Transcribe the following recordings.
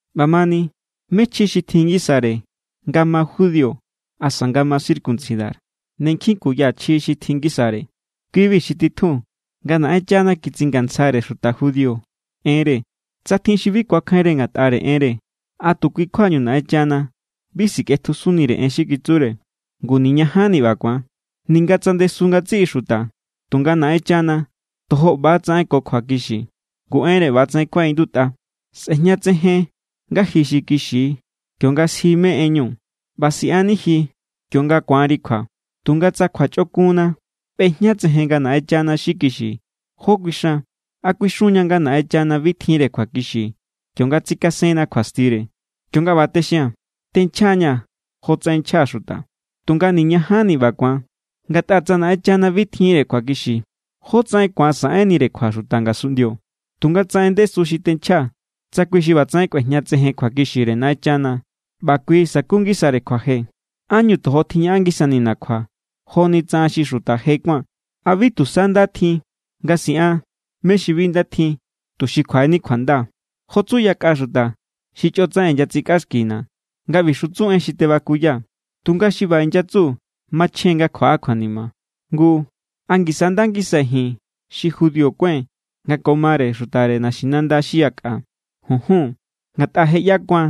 ꞌBamani, ¿mé= chji xi tjin ngisare nga ma judío asa nga ma circuncidar? Ne nkjin kuya chji xi tjin ngisare. Kui=bi xi titjun nga Naꞌenchana kitsingatsjare xuta judío enre. Tsa tjin xi bi kuakjainre ngatꞌare enre, ¿a tu kui kjuañu Naꞌenchana bi sikꞌetjusunnire en xi kitsure? ¡Ngu niñajanni ꞌba ku̱an! Ninga tsa ndesu ngatsiꞌi xuta, tunga Naꞌenchana tojo ꞌba=tsaꞌen ko kjuakixi. Ngu enre ꞌba=tsaꞌen kuaꞌindutꞌa: Sꞌe̱jñatsejen nga ji xi kixi kionga sji mé= enñu, ꞌba siꞌanni ji kionga ku̱anri kjua. Tunga tsa kjuachꞌokunna ꞌbejñatsejen nga Naꞌenchana xi kixi, ¿jó kuixan? ¿A kuixun=ña nga Naꞌenchana bi tjinre kjuakixi kionga tsikasenna kjuastire? (Kionga ꞌba texia̱n, tenchjaa̱=ña̱ jotsaꞌen nchja xuta.) Tunga, ¡niñajanni ꞌba ku̱an! Ngatꞌa tsa Naꞌenchana bi tjinre kjuakixi, ¿jótsaꞌen ku̱an saꞌenire kjua xuta ngasunꞌndio? Tunga tsa en ndesu xi tenchjaa̱ tsa kui= xi ꞌbatsaꞌen kꞌuejñatsejen kjuakixire Naꞌenchana ꞌba kui sa̱ku=ngisare kjuaje, ¿ánñu tojo tjiñaꞌan ngisanina̱ kjua joni tsa an xi xuta je kuáa̱n? ¿A bi tusa nda tjin nga siꞌan mé= xi bi nda tjin, tuxi kjuaꞌeni kjuanda? Jo tsu yakꞌa xuta xi chꞌotsaꞌen inyatsikꞌaxkina̱ nga ꞌbixu tsu en xi tebakuyaa̱. Tunga xi ꞌba inyatsu machjen nga kjuaꞌa kjuanima. Ngu, ¿a ngisa nda ngisai̱ ji̱n xi judío kuái̱n nga ko mare xutare naxinanda xi yakꞌa? ¡Junjun! Ngatꞌa je= ꞌyakua̱n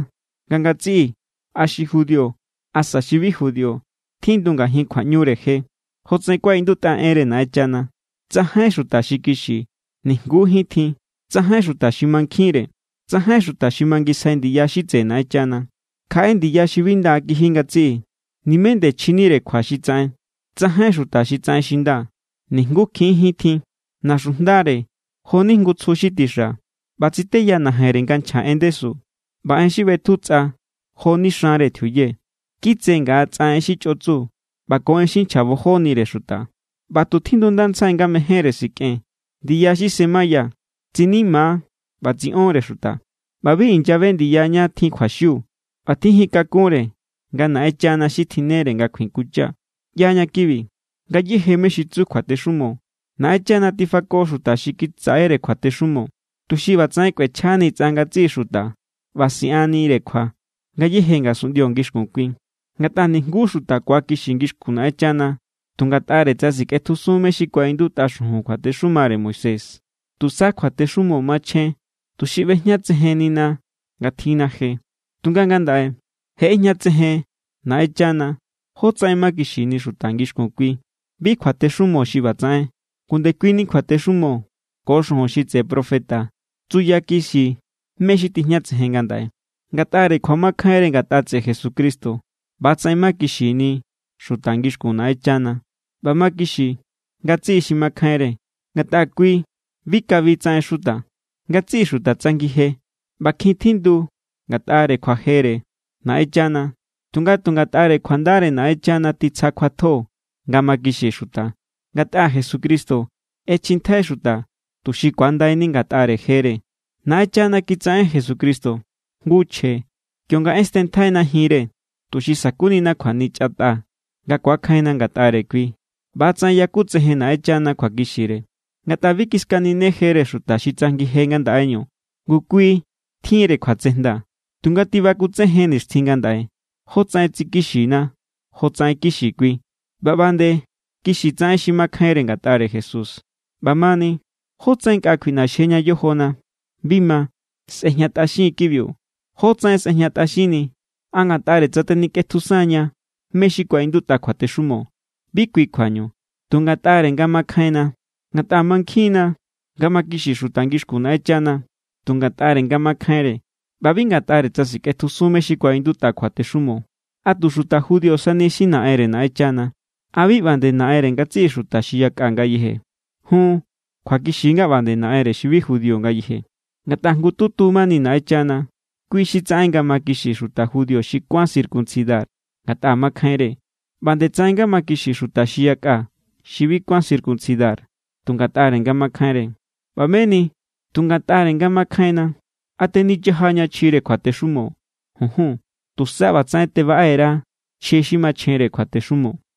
nga ngatsiꞌi, a xi judío asa xi bi judío tjindu ngajin kjuaꞌñure je. Jotsaꞌen kuaꞌindutꞌa enre Naꞌenchana: Tsajain xuta xi kixi, nijngujín tjin. Tsajain xuta xi mankjinre. Tsajain xuta xi mangisjai ndiya xi tseꞌe Naꞌenchana. Kjaꞌe ndiya xi bi nda kiji ngatsiꞌi, nimé nde chjinire kjua xi tsaꞌen. Tsajain xuta xi tsaꞌen xi nda, nijngukjinjín tjin. Naxujndare joni jngu tsju xi tixa, ꞌba tsiteya najenre nga nchja en ndesu, ꞌba en xi ꞌbetju tsꞌa joni xanre tjiuye. Kitse ngaꞌa tsꞌa en xi chꞌotsu ꞌba ko en xi nchjabojonire xuta. ꞌBa tu tjindundantsjai nga mejénre sikꞌen. Ndiya xi semaya tsinima= ꞌba tsiꞌon=re xuta, ꞌba bi inyabe ndiya ñá tjin kjuaxiu. Bi tjijin kakunre nga Naꞌenchana xi tjinnere nga kjuikuncha. ꞌYaña kibi. Ngayéje mé= xi tsu kjuatexumo, Naꞌenchana tifako xuta xi kitsaꞌere kjuatexumo, tuxi ꞌbatsaꞌen kꞌuechjani tsꞌa ngatsiꞌi xuta ꞌba siꞌannire kjua ngayéje ngasunꞌndio ngixkun kui. Ngatꞌa nijngu xuta ku̱akixi ngixkun Naꞌenchana tu ngatꞌare tsa sikꞌetjusun mé= xi kuaꞌindutꞌa xujun kjuatexumare Moisés. Tusa kjuatexumo machjen tuxi ꞌbejñatsejennina nga tjinna je. Tunga ngandaꞌe, je ꞌejñatsejen Naꞌenchana jótsaꞌen makixini xuta ngixkun kui. Bi kjuatexumo xi ꞌbatsaꞌen, ngu ndekuini kjuatexumo ko xujun xi tseꞌe profeta tsuyakixi mé= xi tijñatsejen ngandaꞌe. Ngatꞌare kjuamakjainre ngatꞌa tseꞌe Jesucristo, ꞌba=tsaꞌen makixini xuta ngixkun Naꞌenchana. ꞌBa makixi ngatsiꞌi xi makjainre, ngatꞌa kui bi kabi tsaꞌen xuta. Ngatsiꞌi xuta tsajngi je ꞌba kjin tjindu ngatꞌare kjuajere Naꞌenchana. Tunga tu ngatꞌare kjuandare Naꞌenchana titsja kjuatjo nga makixi xuta, ngatꞌa Jesucristo ꞌechjintjai xuta tuxi kuandaini ngatꞌare jere. Naꞌenchana kitsaꞌen Jesucristo jngu chje kionga ꞌestenntjaina jinre, tuxi sa̱kunina kjuanichatꞌa nga ku̱akjainna ngatꞌare kui. ꞌBa=tsaꞌen yakutsejen Naꞌenchana kjuakixire. Ngatꞌa bi kiskaninejere xuta xi tsajngi je ngandaꞌeñu, ngu kui tjinre kjuatsejnda. Tunga tibakutsejen nixtjin ngandaꞌe jótsaꞌen tsikixina; jotsaꞌen kixi kui, ꞌba ꞌba nde kixi tsaꞌen xi makjainre ngatꞌare Jesús. ꞌBamani, ¿jótsaꞌen nkꞌa kjuiꞌnaxjeña yojona? Bi ma. Sꞌejñatꞌaxin= kibiu. ¿Jótsaꞌen sꞌejñatꞌaxinni? ¿A ngatꞌare tsa tenikꞌetjusun=ña mé= xi kuaꞌindutꞌa kjuatexumo? Bi kui kjuañu. Tu ngatꞌare nga makjainna. Ngatꞌa mankjinna nga mani nga makixi xuta ngixkun Naꞌenchana tu ngatꞌare nga makjainre ꞌba bi ngatꞌare tsa sikꞌetjusun mé= xi kuaꞌindutꞌa kjuatexumo. ¿A tu xuta judío sani xi Naꞌenre Naꞌenchana? ¿A bi ꞌba nde Naꞌenre ngatsiꞌi xuta xi yakꞌa ngayeje? Jun, kjuakixi= nga ꞌba nde Naꞌenre xi bi judío ngayeje. Ngatꞌa jngututu mani Naꞌenchana. Kui xi tsaꞌen nga makixi xuta judío xi kuán circuncidar ngatꞌa makjainre, ꞌba nde tsaꞌen nga makixi xuta xi yakꞌa xi bi kuán circuncidar tu ngatꞌare nga makjainre. ꞌBa meni, tu ngatꞌare nga makjainna, ¿a tenichajaña chjire kjuatexumo? ¡Junjun! Tusa ꞌbatsaꞌen tebaꞌe_ra chji xi machjenre kjuatexumo.